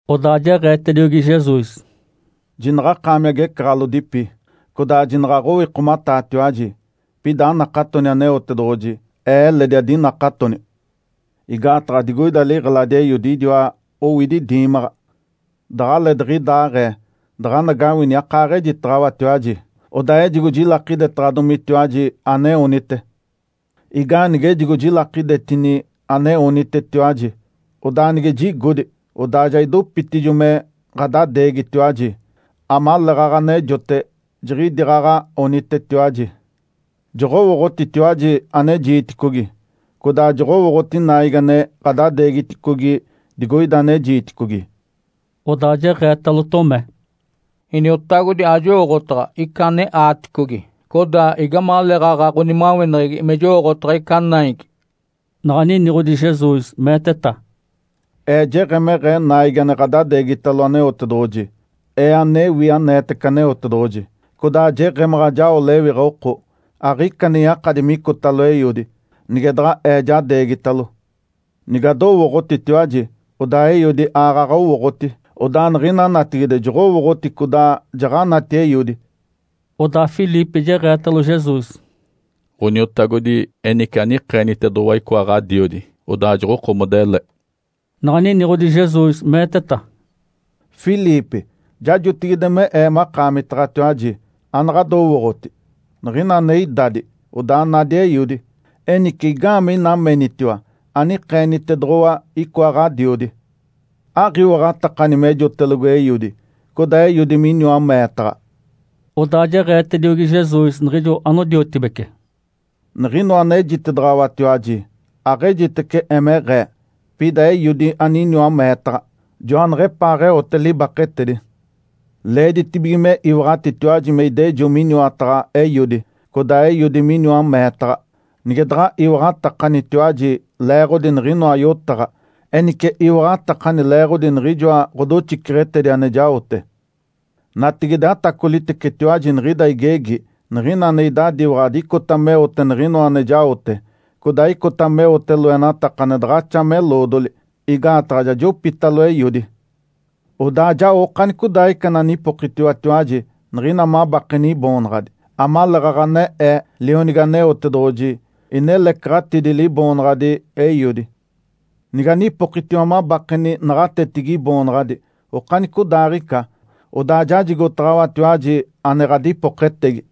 Odaa jeɡ̶eetediogi Jesus, “Jinaɡ̶akaami agecaɡ̶alodipi, codaa jinaɡ̶a aɡ̶owikomataatiwaji. Pida anakatoni Aneotedoɡ̶oji. Ee eledi adinakatoni. Igaataɡ̶a digoida liɡ̶eladi Eiodi idiwa owidi diimaɡ̶a. Daɡ̶aleetiɡ̶idaaɡ̶ee daɡ̶anagawini akaaɡ̶ejitaɡ̶awatiwaji. Odaa ejigo jilakidetaɡ̶adomitiwaji ane onite. Igaanige ejigo jilakidetini ane onitetiwaji. Odaa nige jigodi, odaa ja idopitacijo me ɡ̶adadeegitiwaji, amaleeɡ̶aɡ̶a anejote, jiɡ̶idiaaɡ̶aɡ̶a onitetiwaji. Joɡ̶owooɡ̶otitiwaji ane jiiticogi, codaa joɡ̶owooɡ̶oti naigi ane ɡ̶adadeegiticogi digoida ane jiiticogi”. Odaa jeɡ̶eetalo Tomé, “Iniotagodi, ajowooɡ̶otaɡ̶a ica ane aaticogi. Codaa, igamaleeɡ̶aɡ̶a ɡ̶onimaweneɡ̶egi me jowooɡ̶otaɡ̶a ica naigi?” Naɡ̶a niniɡ̶odi Jesus, meeteta, “Ee jeɡ̶emeɡ̶ee naigi ane ɡ̶adadeegitalo Aneotedoɡ̶oji, Ee anewi aneetece Aneotedoɡ̶oji, codaa jeɡ̶emaɡ̶a jao lewiɡ̶a oko. Aɡ̶ica ane yakadi micotalo Eiodi, nige daɡ̶a Ee jadeegitalo. Nigadowooɡ̶otitiwaji, odaa Eiodi aaɡ̶aɡ̶a owooɡ̶oti. Odaa niɡ̶ina natigide joɡ̶owooɡ̶oti codaa jaɡ̶anati Eiodi.” Odaa Filipe jeɡ̶eetalo Jesus, “Ǥoniotagodi, enice anikeenitedoɡ̶owa icoa Ǥadiodi. Odaa joɡ̶okomoda ele”. Naɡ̶a niniɡ̶odi Jesus, meeteta, “Filipe. Ja jotigide me Ee makaamitaɡ̶atiwaji. Anaɡ̶adowooɡ̶oti? Niɡ̶ina ane idadi, odaa nadi Eiodi. Enice, igaamee ina menitiwa, ‘Anikeenitedoɡ̶owa icoa Ǥadiodi’? Aɡ̶iwaɡ̶atakani mejotelogo Eiodi, codaa Eiodi miniwa meetaɡ̶a?” Odaa jeɡ̶eetediogi Jesus niɡ̶ijo anodiotibece, “Niɡ̶inoa anejitedaɡ̶awatiwaji, aɡ̶ejitece emeɡ̶ee. Pida Eiodi aniniwa meetaɡ̶a, joaneɡ̶epaaɡ̶eote libaketedi. Leeditibige me iwaɡ̶atitiwaji me idejo miniwataɡ̶a Eiodi, codaa Eiodi miniwa meetaɡ̶a. Nige daɡ̶a iwaɡ̶atakanitatiwaji leeɡ̶odi niɡ̶inoa yotaɡ̶a, enice iwaɡ̶atakani leeɡ̶odi niɡ̶ijoa ɡ̶odoxiceɡ̶etedi ane jaote. Natigide atacolitecetiwaji niɡ̶ida igegi. Niɡ̶ina ane idadiwaɡ̶adi icota meote niɡ̶inoa ane jaote, codaa icota meote loenataka ane daɡ̶axa me eloodoli, igaataɡ̶a ja jopitalo Eiodi. Odaa jao okanicodaaɡ̶ica ananipokitiwatiwaji niɡ̶ina mabakeni Iboonaɡ̶adi, amaleeɡ̶aɡ̶a ane Ee, Lionigi Aneotedoɡ̶oji, inelecaɡ̶atidi Liboonaɡ̶adi Eiodi. Niganipokitiwa mabakeni naɡ̶atetigi Iboonaɡ̶adi okanicodaaɡ̶ica, odaa jajigotaɡ̶awatiwaji ane ɡ̶adipoketegi.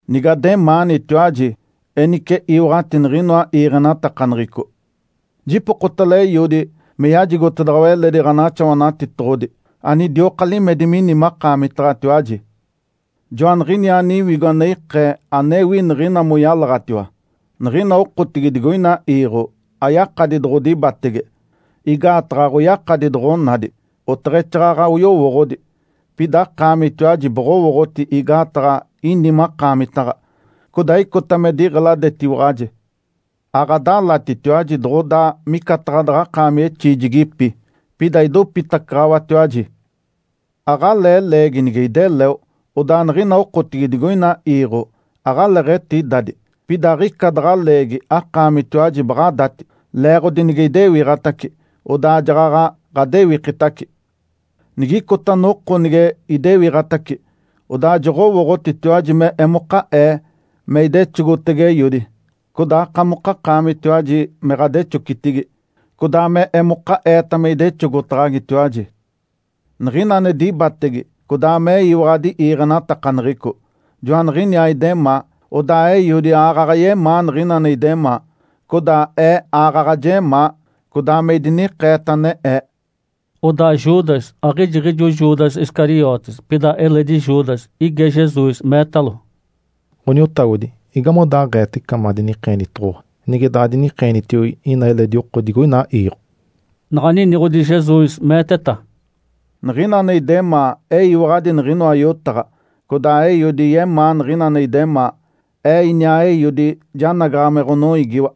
Nigademaanitiwaji, enice iwaɡ̶ati niɡ̶inoa iiɡ̶enatakaneɡ̶eco. Jipokotalo Eiodi me yajigotedaɡ̶awa eledi Ǥanaxawanatitoɡ̶odi, anidioka limedi mini makaamitaɡ̶atiwaji. Joaniɡ̶iniaa Niwigo ane ikee anewi niɡ̶ina moyalaɡ̶atiwa. Niɡ̶ina okotigi digoina iiɡ̶o ayakadi doɡ̶odibatege, igaataɡ̶a aɡ̶oyakadi doɡ̶onadi, oteɡ̶exaaɡ̶aɡ̶a oyowooɡ̶odi. Pida akaamitiwaji boɡ̶owooɡ̶oti igaataɡ̶a ini makaamitaɡ̶a, codaa icota me diɡ̶eladetiwaɡ̶aji. Aɡ̶adalatitiwaji doɡ̶odaa micataɡ̶a daɡ̶akaami exiijigipi. Pida idopitacaɡ̶awatiwaji. Aɡ̶alee leegi nige ideleo, odaa niɡ̶ina okotigi digoina iiɡ̶o aɡ̶aleeɡ̶etidadi. Pida aɡ̶ica daɡ̶a leegi akaamitiwaji baɡ̶adati. Leeɡ̶odi nige idewiɡ̶atace, odaa jaɡ̶aɡ̶a ɡ̶adewikitace. Nigicota noko nige idewiɡ̶atace, odaa joɡ̶owooɡ̶otitiwaji me emoka Ee me idexogotege Eiodi, codaa akamokakaamitatiwaji me ɡ̶adexocitigi, codaa me emoka Eeta me idexogotaɡ̶agitiwaji. Niɡ̶ina ane dibatege codaa meyiwaɡ̶adi iiɡ̶enatakaneɡ̶eco, joaniɡ̶iniaa idemaa. Odaa Eiodi aaɡ̶aɡ̶a yemaa niɡ̶ina ane idemaa. Codaa Ee aaɡ̶aɡ̶a jemaa, codaa me idinikeeta ane Ee.” Odaa Judas, aɡ̶ijiɡ̶ijo Judas Iscariotes, pida eledi Judas, ige Jesus, meetalo, “Ǥoniotagodi, igamodaaɡ̶eeta ica madinikeenitoɡ̶owa, nige daɡ̶adinikeenitiogi ina eledi oko digoina iiɡ̶o?” Naɡ̶a niniɡ̶odi Jesus, meeteta, “Niɡ̶ina ane idemaa eyiwaɡ̶adi niɡ̶inoa yotaɡ̶a, codaa Eiodi yemaa niɡ̶ina ane idemaa. Ee iniaa Eiodi janagaɡ̶a me ɡ̶onoiigiwa.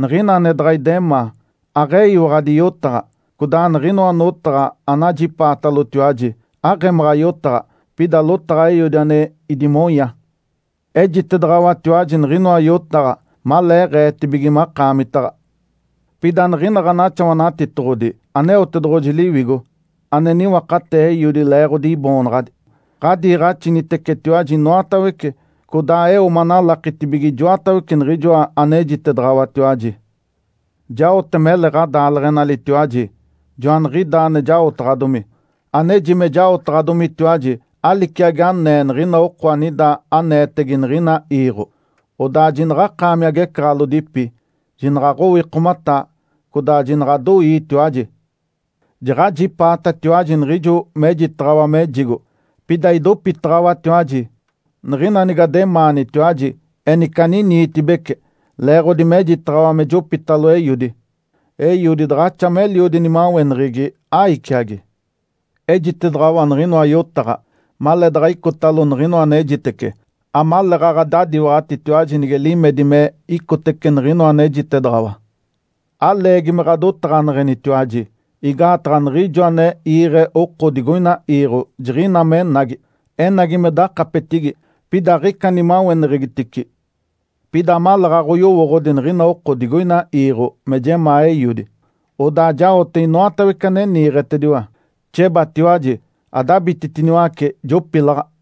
Niɡ̶ina ane daɡ̶a idemaa, aɡ̶eyiwaɡ̶adi yotaɡ̶a. Codaa niɡ̶inoa notaɡ̶a anajipaatalotiwaji, aɡ̶emaɡ̶a yotaɡ̶a, pida lotaɡ̶a Eiodi ane idimonya. Ejitedaɡ̶awatiwaji niɡ̶inoa yotaɡ̶a maleeɡ̶eetibige makaamitaɡ̶a. Pida Niɡ̶ina Ǥanaxawanatitoɡ̶odi, Aneotedoɡ̶oji Liwigo, ane niwakatee Eiodi leeɡ̶odi Iboonaɡ̶adi, ɡ̶adiiɡ̶axinitecetiwaji inoatawece, codaa eo manalakitibige ijoatawece niɡ̶ijoa anejitedaɡ̶awatiwaji. Jaote mele ɡ̶adaaleɡ̶enalitiwaji. Joaniɡ̶idaa ane jaotaɡ̶adomi. Aneji me jaotaɡ̶adomitiwaji aliciagi anee niɡ̶ina oko anida aneetege niɡ̶ina iiɡ̶o. Odaa jinaɡ̶akaami agecaɡ̶alodipi, jinaɡ̶aɡ̶owikomataa, codaa jinaɡ̶adoiitiwaji. Jaɡ̶ajipaatatiwaji niɡ̶ijo mejitaɡ̶awa mejigo, pida idopitaɡ̶awatiwaji. Niɡ̶ina nigademaanitiwaji enice aniniitibeci leeɡ̶odi mejitaɡ̶awa me jopitalo Eiodi. Eiodi daɡ̶axa meliodi nimaweneɡ̶egi, aiciagi. Ejitedaɡ̶awa niɡ̶inoa yotaɡ̶a, maleedaɡ̶a icotalo niɡ̶inoa anejitece, amaleeɡ̶aɡ̶a adadiwaɡ̶atitiwaji nige limedi me icotece niɡ̶inoa anejitedaɡ̶awa. Aleegi me ɡ̶adotaɡ̶aneɡ̶enitiwaji, igaataɡ̶a niɡ̶ijo ane iiɡ̶e oko digoina iiɡ̶o jiɡ̶ina menagi. Enagi me dakapetigi, pida aɡ̶ica nimaweneɡ̶egitici. Pida amaleeɡ̶aɡ̶a oyowooɡ̶odi niɡ̶ina oko digoina iiɡ̶o me jemaa Eiodi, odaa jaote inoatawece ane niiɡ̶etediwa. Xebatiwaji, adabititiniwace, jopilaɡ̶a!”